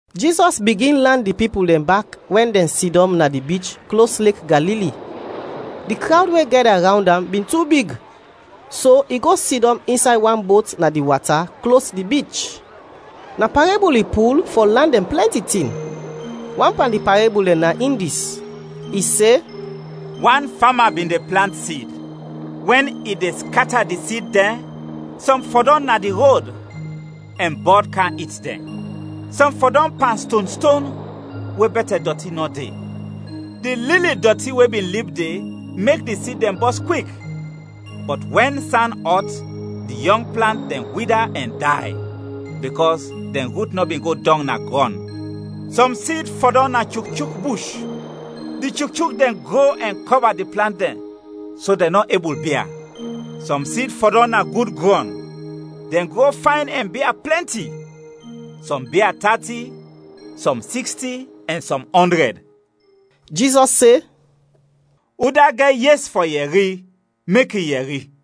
Jizɔs bigin lan di pipul dɛn bak wɛn dɛn sidɔm na di bich klos Lek Galili. Di krawd we gɛda rawnd am bin tu big, so i go sidɔm insay wan bot na di wata, klos di bich. Na parebul i pul fɔ lan dɛn plɛnti tin; wan pan di parebul dɛn na in dis: I se, “Wan fama bin de plant sid. Wɛn i de skata di sid dɛn, sɔm fɔdɔm na di rod, ɛn bɔd kam it dɛn. Sɔm fɔdɔm pan stonston, we bɛtɛ dɔti nɔ de. Di lili dɔti we bin lib de mek di sid dɛn bɔs kwik, bɔt wɛn san ɔt, di yɔng plant dɛn wida ɛn day, bikɔs dɛn rut nɔ bin go dɔng na grɔn. Sɔm sid fɔdɔm na chukchuk bush, di chukchuk dɛn gro ɛn kɔba di plant dɛn so dɛn nɔ ebul bia. Sɔm sid fɔdɔm na gud grɔn, dɛn gro fayn ɛn bia plɛnti. Sɔm bia tati, sɔm siksti ɛn sɔm ɔndrɛd.” Jizɔs se, “Udat gɛt yes fɔ yɛri, mek i yɛri!”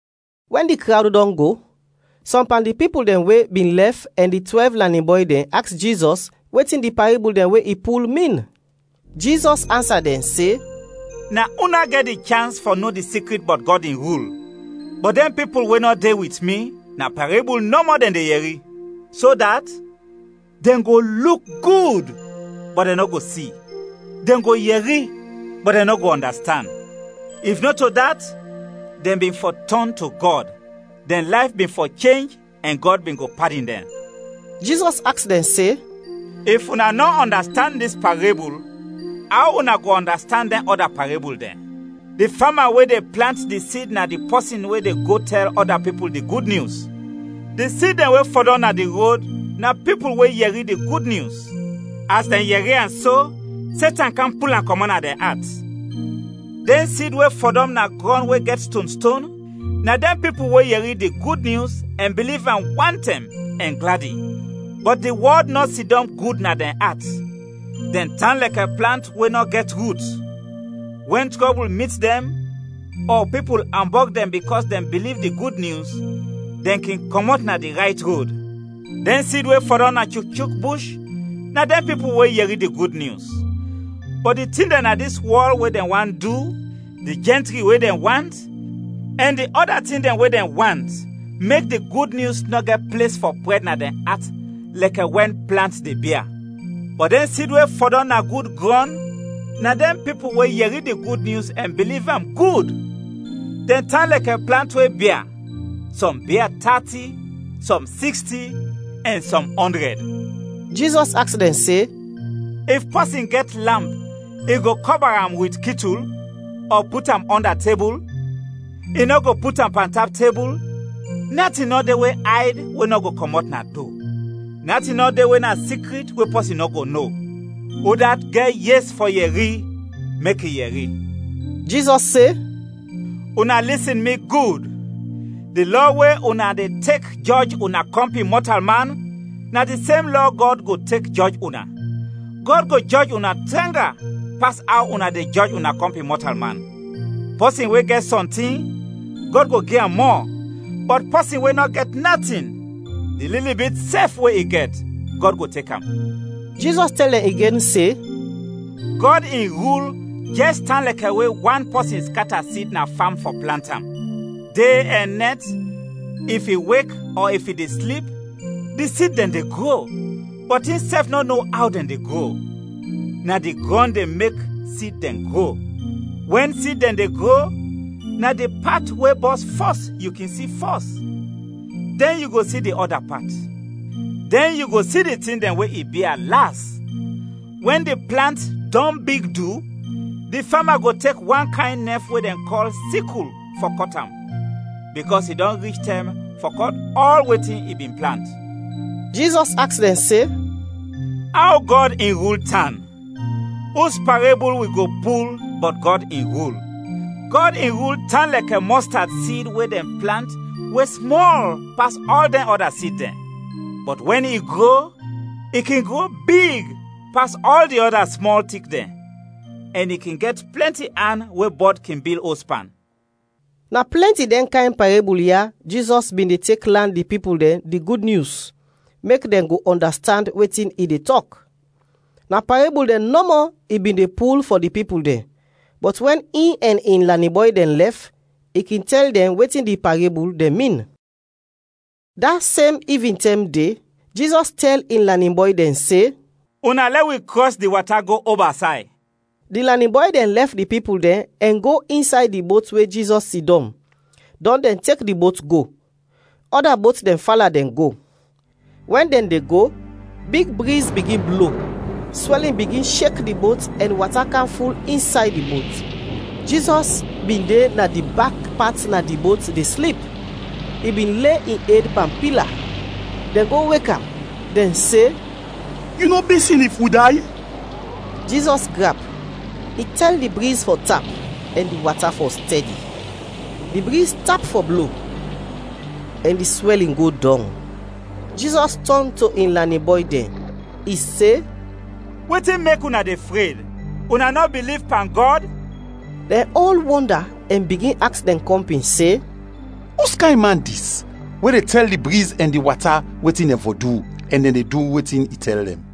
Wɛn di krawd dɔn go, sɔm pan di pipul dɛn we bin lɛf ɛn di twɛlv lanin bɔy dɛn aks Jizɔs wetin di parebul dɛn we i pul, min. Jizɔs ansa dɛn se, “Na una gɛt di chans fɔ no di sikrit bɔt Gɔd in rul, bɔt dɛn pipul we nɔ de wit wi, na parebul nɔmɔ dɛn de yɛri, so dat ‘Dɛn go luk gud, bɔt dɛn nɔ go si; dɛn go yɛri, bɔt dɛn nɔ go ɔndastand. If nɔto dat, dɛn bin fɔ tɔn to Gɔd, dɛn layf bin fɔ chenj ɛn Gɔd bin go padin dɛn.’” Jizɔs aks dɛn se, “If una nɔ ɔndastand dis parebul, aw una go ɔndastand dɛn ɔda parebul dɛn? Di fama we de plant di sid na di pɔsin we de go tɛl ɔda pipul di Gud Nyus. Di sid dɛn we fɔdɔm na di rod na pipul we yɛri di Gud Nyus; as dɛn yɛri am so, Setan kam pul am kɔmɔt na dɛn at. Dɛn sid we fɔdɔm na grɔn we gɛt stonston, na dɛn pipul we yɛri di Gud Nyus ɛn biliv am wantɛm ɛn gladi. Bɔt di wɔd nɔ sidɔm gud na dɛn at; dɛn tan lɛkɛ plant we nɔ gɛt rut. Wɛn trɔbul mit dɛn, ɔ pipul ambɔg dɛn bikɔs dɛn biliv di Gud Nyus, dɛn kin kɔmɔt na di rayt rod. Dɛn sid we fɔdɔm na chukchuk bush na dɛn pipul we yɛri di Gud Nyus, bɔt di tin dɛn na dis wɔl we dɛn want du, di jɛntri we dɛn want, ɛn di ɔda tin dɛn we dɛn want mek di Gud Nyus nɔ gɛt ples fɔ prɛd na dɛn at lɛkɛ wɛn plant de bia. Bɔt dɛn sid we fɔdɔm na gud grɔn na dɛn pipul we yɛri di Gud Nyus ɛn biliv am gud; dɛn tan lɛkɛ plant we bia: sɔm bia tati, sɔm siksti, ɛn sɔm ɔndrɛd.” Jizɔs aks dɛn se, “If pɔsin gɛt lamp, i go kɔba am wit kitul, ɔ put am ɔnda tebul? I nɔ go put am pantap tebul? Natin nɔ de we ayd we nɔ go kɔmɔt na do. Natin nɔ de we na sikrit we pɔsin nɔ go no. Udat gɛt yes fɔ yɛri, mek i yɛri!” Jizɔs se, “Una lisin mi gud; di lɔ we una de tek jɔj una kɔmpin mɔtalman, na di sem lɔ Gɔd go tek jɔj una. Gɔd go jɔj una tranga pas aw una de jɔj una kɔmpin mɔtalman. Pɔsin we gɛt sɔntin, Gɔd go gi am mɔ, bɔt pɔsin we nɔ gɛt natin, di lili bit sɛf we i gɛt, Gɔd go tek am.” Jizɔs tɛl dɛn igen se, “Gɔd in rul jɛs tan lɛkɛ we wan pɔsin skata sid na fam fɔ plant am. De ɛn nɛt, if i wek ɔ if i de slip, di sid dɛn de gro, bɔt insɛf nɔ no aw dɛn de gro. Na di grɔn de mek sid dɛn gro. Wɛn sid dɛn de gro, na di pat we bɔs fɔs yu kin si fɔs, dɛn yu go si di ɔda pat, dɛn yu go si di tin dɛn we i bia, las. Wɛn di plant dɔn big du, di fama go tek wan kayn nɛf we dɛn kɔl sikul fɔ kɔt am, bikɔs i dɔn rich tɛm fɔ kɔt ɔl wetin i bin plant.” Jizɔs aks dɛn se, “Aw Gɔd in rul tan? Us parebul wi go pul bɔt Gɔd in rul? Gɔd in rul tan lɛkɛ mɔstad sid we dɛn plant we smɔl pas ɔl dɛn ɔda sid dɛn. Bɔt wɛn i gro, i kin gro big pas ɔl di ɔda smɔl tik dɛn, ɛn i kin gɛt plɛnti an we bɔd kin bil os pan.” Na plɛnti dɛn kayn parebul ya Jizɔs bin de tek lan di pipul dɛn di Gud Nyus, mek dɛn go ɔndastand wetin i de tɔk. Na parebul dɛn nɔmɔ i bin de pul fɔ di pipul dɛn, bɔt wɛn in ɛn in lanin bɔy dɛn lɛf, i kin tɛl dɛn wetin di parebul dɛn min. Da sem ivintɛm de, Jizɔs tɛl in lanin bɔy dɛn se, “Una lɛ wi krɔs di wata go oba say.” Di lanin bɔy dɛn lɛf di pipul dɛn ɛn go insay di bot we Jizɔs sidɔm, dɔn dɛn tek di bot go. Ɔda bot dɛn fala dɛn go. Wɛn dɛn de go, big briz bigin blo, swɛlin bigin shek di bot ɛn wata kam ful insay di bot. Jizɔs bin de na di bak pat na di bot de slip; i bin le in ed pan pila. Dɛn go wek am, dɛn se, “Yu nɔ bisin if wi day?” Jizɔs grap. I tɛl di briz fɔ tap ɛn di wata fɔ stɛdi. Di briz tap fɔ blo ɛn di swɛlin go dɔng. Jizɔs tɔn to in lanin bɔy dɛn, i se, “Wetin mek una de fred, una nɔ biliv pan Gɔd?” Dɛn ɔl wɔnda ɛn bigin aks dɛn kɔmpin se, “Uskayn man dis we de tɛl di briz ɛn di wata wetin dɛn fɔ du ɛn de du wetin i tɛl dɛn?”